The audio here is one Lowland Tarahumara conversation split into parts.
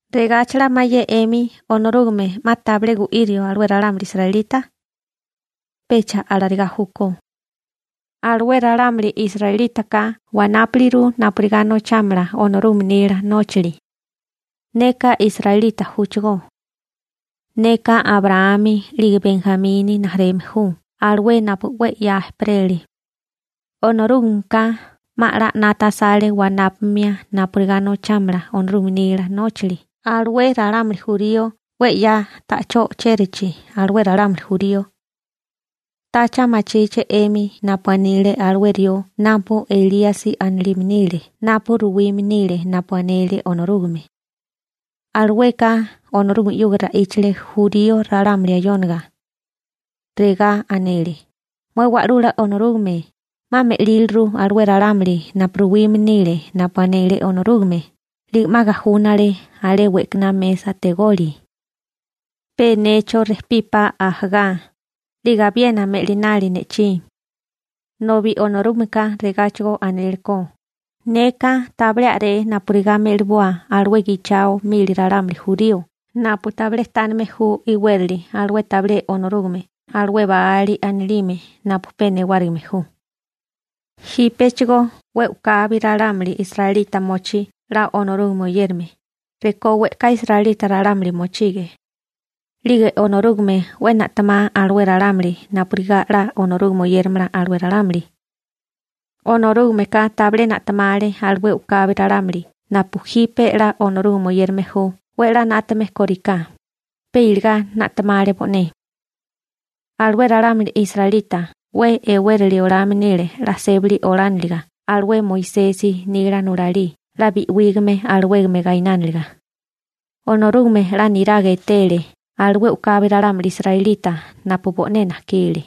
¿Regáchala mayé 'emi Onorúgame 'ma tabilé gu'írio alué ralámuli israelita? Pecha alarigá júkó. Alué ralámuli israelítaka wanápuliru napurigá nochámala Onorúgame nila nóchali. Neka israelita júchigó. Neka Abraámi 'lige Benjamini rijimala ju alué napu 'we 'ya ejperele. Onorúgameka 'ma 'la 'nata asale wanápamia napurigá nochámala Onorúgame nila nóchali alué ralámuli jurío 'we 'ya ta'chó o'chérachi alué ralámuli jurío. ¿Tacha machíché 'emi napu anile alué rió napu Elíasi anilime nile napu ruwime nile napu anele Onorúgame? Alueka Onorúgame 'yuga ra'íchale jurío ralámuli ayóniga. Regá anele: «Mué Wa'lula Onorúgame, 'ma me'líliru alué ralámuli napu ruwime nile napu anele Onorúgame, 'lige 'ma gajúnale alé we'kaná mesa tegoli. Pe necho rejpípá ajagá, 'lige abiena me'linali ne'chí.» Nobi Onorúgameka regáchigo anélekó: «Neka tabilé a'ré napurigá me'liboa alué gichao mili ralámuli jurío napu tabilé tánime ju iwérali alué tabilé Onorúgame alué Baáli anilime napu pe newárigime ju.» Jípechigó 'we u'kabi ralámuli israelita mochí 'la Onorúgame oyérame, rekó we'ká israelita ralámuli mochige. 'Lige Onorúgame 'we na'temá alué ralámuli napurigá 'la Onorúgame oyéramala alué ralámuli. Onorúgameka tabilé na'temale alué u'kabi ralámuli napu jipe 'la Onorúgame oyérame ju 'we 'la 'nátame kóriká, pe iligá na'temale bo'né. Alué ralámuli israelita 'we e'wérali olame nile 'la sébali olániliga alué Moisesi nila nulalí 'la bi'wígame alawégame gainániliga. Onorúgame 'la niraga etele alué u'kabi ralámuli israelita napu bo'né najkile.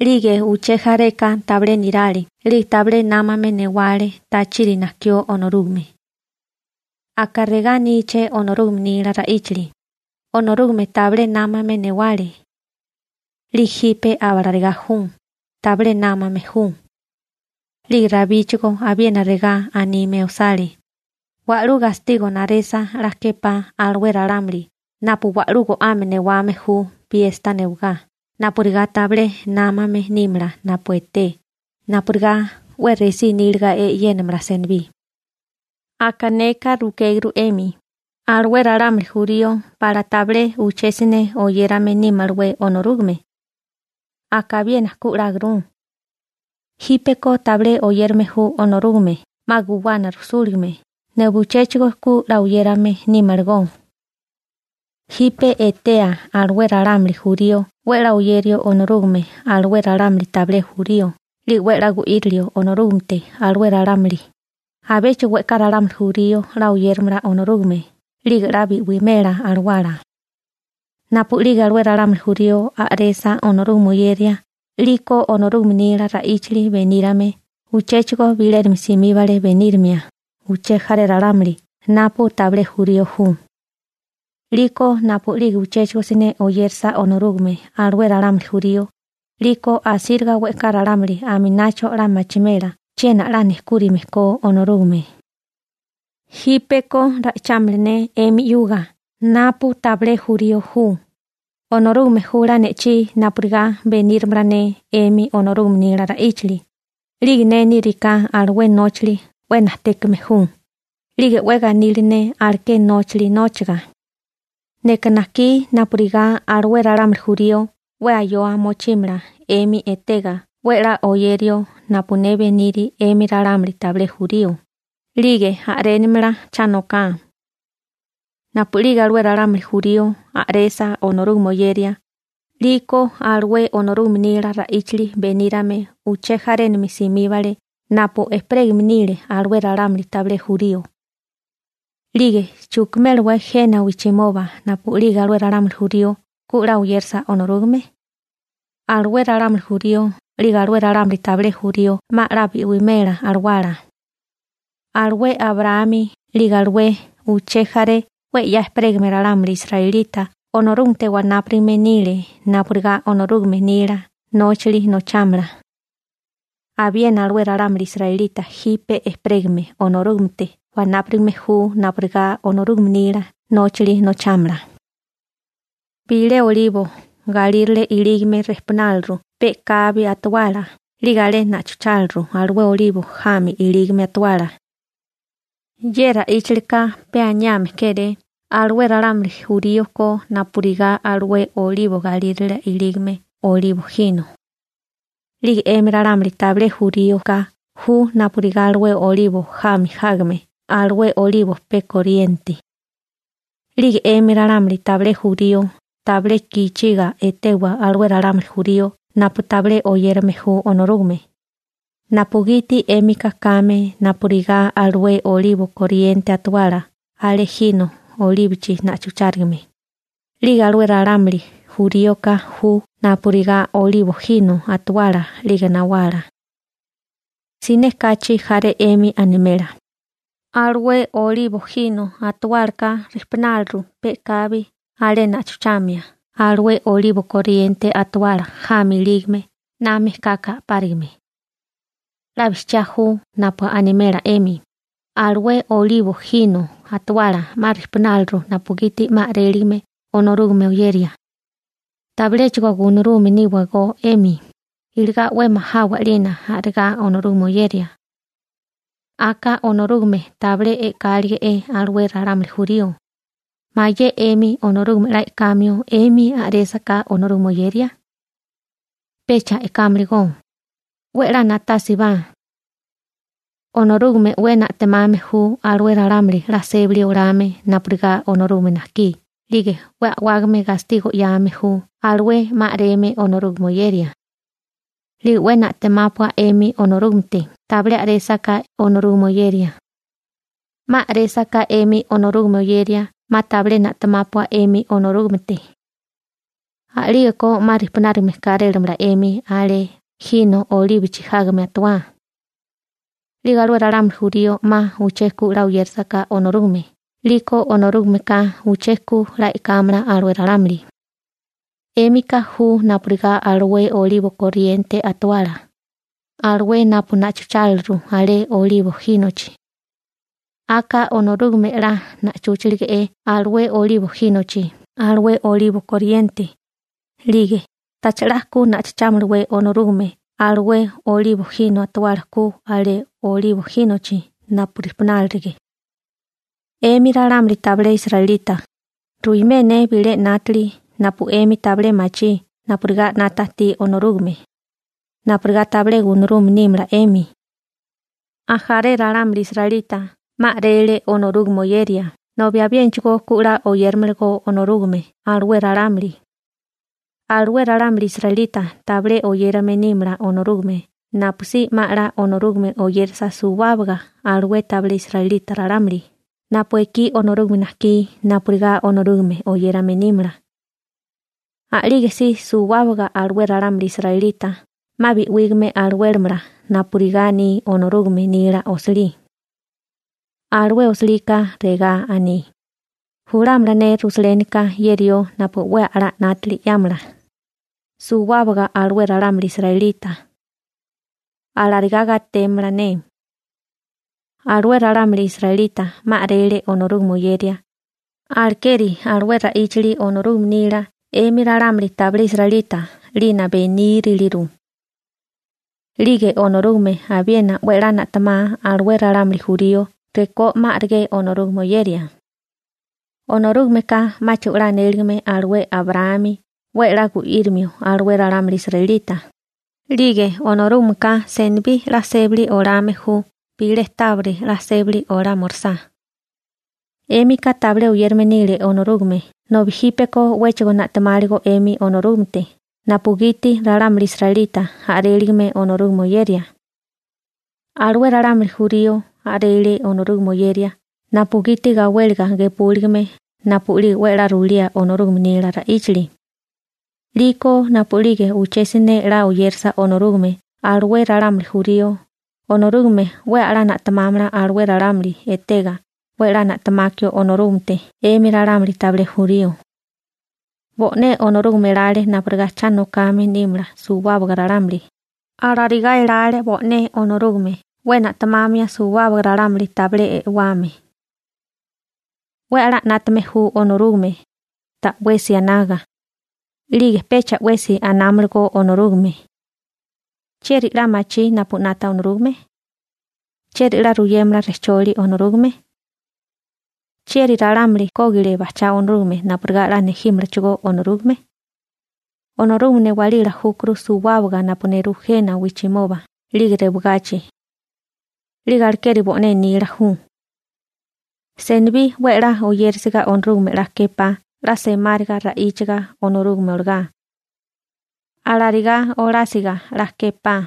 'Lige uché jareka tabilé nirale 'lige tabilé námame newale tachiri najkió Onorúgame. Aka regá aníché Onorúgame nila ra'íchali: «Onorúgame tabilé námame newale. 'Lige jipe abalarigá ju, tabilé námame ju.» 'Lige Rabíchigó abiena regá anime osale: Wa'lú gastigo naresa 'la képá alué ralámuli napu wa'lú go'ame newame ju piesta newagá napurigá tabilé námame nímala napu eté napurigá 'we resí níliga e'yénamala senibí. Aka neka rukéguru 'emi: ¿Alué ralámuli jurío pala tabilé uché siné oyérame nímalawé Onorúgame? Aka abiena ku 'láguru. Jípeko tabilé oyérame ju Onorúgame 'ma guwana rujsúligame nobi uchéchigo ku 'la oyérame nímalagó. Jipe etea alué ralámuli jurío 'we 'la oyerio Onorúgame alué ralámuli tabilé jurío 'lige 'we 'la gu'irilio Onorúgamete alué ralámuli, abéchigo we'ká ralámuli jurío 'la oyéramala Onorúgame 'lige 'la bi'wimela alawala. Napu'lige alué ralámuli jurío a'resa Onorúgame oyeria 'liko Onorúgame nila ra'íchali benírame uchéchigo bilénami simíbale benírimia uché jaré ralámuli napu tabilé jurío ju. 'Liko napu'lige uchéchigo siné oyérasa Onorúgame alué ralámuli jurío, 'liko asíriga we'ká ralámuli aminacho 'la machimela chiena 'la nejkúrime ko Onorúgame. Jípeko ra'ichámala ne 'emi 'yuga napu tabilé jurío ju, Onorúgame jula ne'chí napurigá beníramala ne 'emi Onorúgame nila ra'íchali, 'lige ne níriká alué nóchali 'we najtékame ju, 'lige 'we ganili ne aleké nóchali nóchaga. Neka najkí napurigá alué ralámuli jurío 'we ayoa mochímala 'emi etega 'we 'la oyerio napu ne beniri 'emi ralámuli tabilé jurío, 'lige a'rénimala cha noká. Napu'lige alué ralámuli jurío a'resa Onorúgame oyeria, 'liko alué Onorúgame nila ra'íchali benírame uché jarénami simíbale napu ejperégame nile alué ralámuli tabilé jurío. 'Lige ¿chukimélawé jena wijchimoba napu'lige alué ralámuli jurío ku 'la oyérasa Onorúgame? Alué ralámuli jurío 'lige alué ralámuli tabilé jurío 'ma 'la bi'wimela alawala. Alué Abraámi 'lige alué uché jaré 'we 'ya ejperégame ralámuli israelita Onorúgamete wanápurigame nile napurigá Onorúgame nila nóchali nochámala, abiena alué ralámuli israelita jipe ejperégame Onorúgamete wanápurigame ju napurigá Onorúgame nila nóchali nochámala. Bilé olibo galírale ilígame rijpunáliru pe'kabi atuala 'lige alé na'chucháliru alué olibo jami ilígame atuala. Ye ra'íchalika pe aniame kéré alué ralámuli jurío ko napurigá alué olibo galírale ilígame olibo jino. 'Lige 'emi ralámuli tabilé juríoka ju napurigá alué olibo jami jágame alué olibo pe koriente. 'Lige 'emi ralámuli tabilé jurío tabilé gichiga etewa alué ralámuli jurío napu tabilé oyérame ju Onorúgame, napugiti 'émika kame napurigá alué olibo koriente atuala alé jino olíbochi na'chuchárigame, 'lige alué ralámuli juríoka ju napurigá olibo jino atuala 'lige nawala. Siné kachi jaré 'emi animela: «Alué olibo jino atuálaka rijpunáliru pe'kabi alé na'chuchamia alué olibo koriente atuala jami ilígame na mejkaka a'párigame.» 'La bijchiá ju napu animela 'emi, alué olibo jino atuala 'ma rijpunálirigo napugiti 'ma a'réligame Onorúgame oyeria. Tabiléchigo gunarume níwagó 'emi, iligá 'we majawa 'lina a'regá Onorúgame oyeria. Aka Onorúgame tabilé e'kálige'é alué ralámuli jurío, ¿mayé 'emi Onorúgame 'la e'kamio 'emi a'résaká Onorúgame oyeria? Pecha e'kámaligó. 'We 'la na'tásibá. Onorúgame 'we na'temame ju alué ralámuli 'la sébali olame napurigá Onorúgame najkí 'lige 'we a'wágame gastigo 'yame ju alué 'ma a'reme Onorúgame oyeria. 'Lige 'we na'temápua 'emi Onorúgamete tabilé a'résaká Onorúgame oyeria. 'Ma a'résaká 'emi Onorúgame oyeria 'ma tabilé na'temápua 'emi Onorúgamete. A'lígeko 'ma rijpunárigame kárélamala 'emi alé jino olíbochi jágame atawá. 'Lige alué ralámuli jurío 'ma uché ku 'la oyérasaká Onorúgame 'liko Onorúgameka uché ku 'la e'kámala alué ralámuli. 'Émika ju napurigá alué olibo koriente atawala, alué napu na'chucháliru alé olibo jínochi. Aka Onorúgame 'la na'chúchalige'é alué olibo jínochi alué olibo koriente, 'lige ¿tacha 'la ku na'chuchámalawé Onorúgame alué Olibo jino atawala ku alé olibo jínochi napu rijpunálirige? 'Emi ralámuli tabilé israelita, ruimé ne bilé 'nátili napu 'emi tabilé machí napurigá 'nata ajtí Onorúgame, napurigá tabilé gunarume nímala 'emi. Ajaré ralámuli israelita 'ma a'rele Onorúgame oyeria nobi abiénachigo ku 'la oyéramalagó Onorúgame alué ralámuli. Alué ralámuli israelita tabilé oyérame nímala Onorúgame napusí 'ma 'la Onorúgame oyérasa suwábaga alué tabilé israelita ralámuli napu ekí Onorúgame najkí napurigá Onorúgame oyérame nímala. A'lige si suwábaga alué ralámuli israelita 'ma bi'wígame alawélamala napurigá aní Onorúgame nila osilí. Alué osilika regá aní: Julámala ne Rusalénika ye rió napu 'we a'lá 'nátili 'yámala suwábaga alué ralámuli israelita. Alarigá gatémala ne. Alué ralámuli israelita 'ma a'rele Onorúgame oyeria, alekeri alué ra'íchali Onorúgame nila 'emi ralámuli tabilé israelita 'lina beníriliru. 'Lige Onorúgame abiena 'we 'la na'temá alué ralámuli jurío rekó 'ma a'regé Onorúgame oyeria. Onorúgameka 'máchigo 'la anéligame alué Abraámi 'we 'la gu'írimio alué ralámuli israelita 'lige Onorúgameka senibí 'la sébali olame ju bilé tábiri 'la sébali olámorisá. 'Émika tabilé oyérame nile Onorúgame nobi jípeko 'wéchigo na'temáligó 'emi Onorúgamete napugiti ralámuli israelita a'réligame Onorúgame oyeria. Alué ralámuli jurío a'rele Onorúgame oyeria napugiti gawéliga gepúligime napu'lige 'we 'la ruilía Onorúgame nila ra'íchali. 'Liko napu'lige uché siné 'la oyérasa Onorúgame alué ralámuli jurío Onorúgame 'we 'la na'temámala alué ralámuli etega 'we 'la na'temakio Onorúgamete 'emi ralámuli tabilé jurío. Bo'né Onorúgame elale napurigá cha nokame nímala suwábaga ralámuli, alarigá elale bo'né Onorúgame 'we na'temamia suwábaga ralámuli tabilé e'wame. 'We a'lá 'nátame ju Onorúgame, ta'wesi anaga. 'Lige pecha 'wesi anámalagó Onorúgame. «¿Chieri 'la machí napu 'nata Onorúgame? ¿Chieri 'la ruyémala rejcholi Onorúgame? ¿Chieri ralámuli kógile bajchá Onorúgame napurigá 'la nejímalachigó Onorúgame?» Onorúgame newálila júkuru suwábaga napu nerú jena wijchimoba 'lige rewagachi. 'Lige alekeri bo'né nila ju. Senibí 'we 'la oyérisiga Onorúgame 'la képá 'la semáriga ra'íchaga Onorúgame olagá. Alarigá olásiga 'la képá.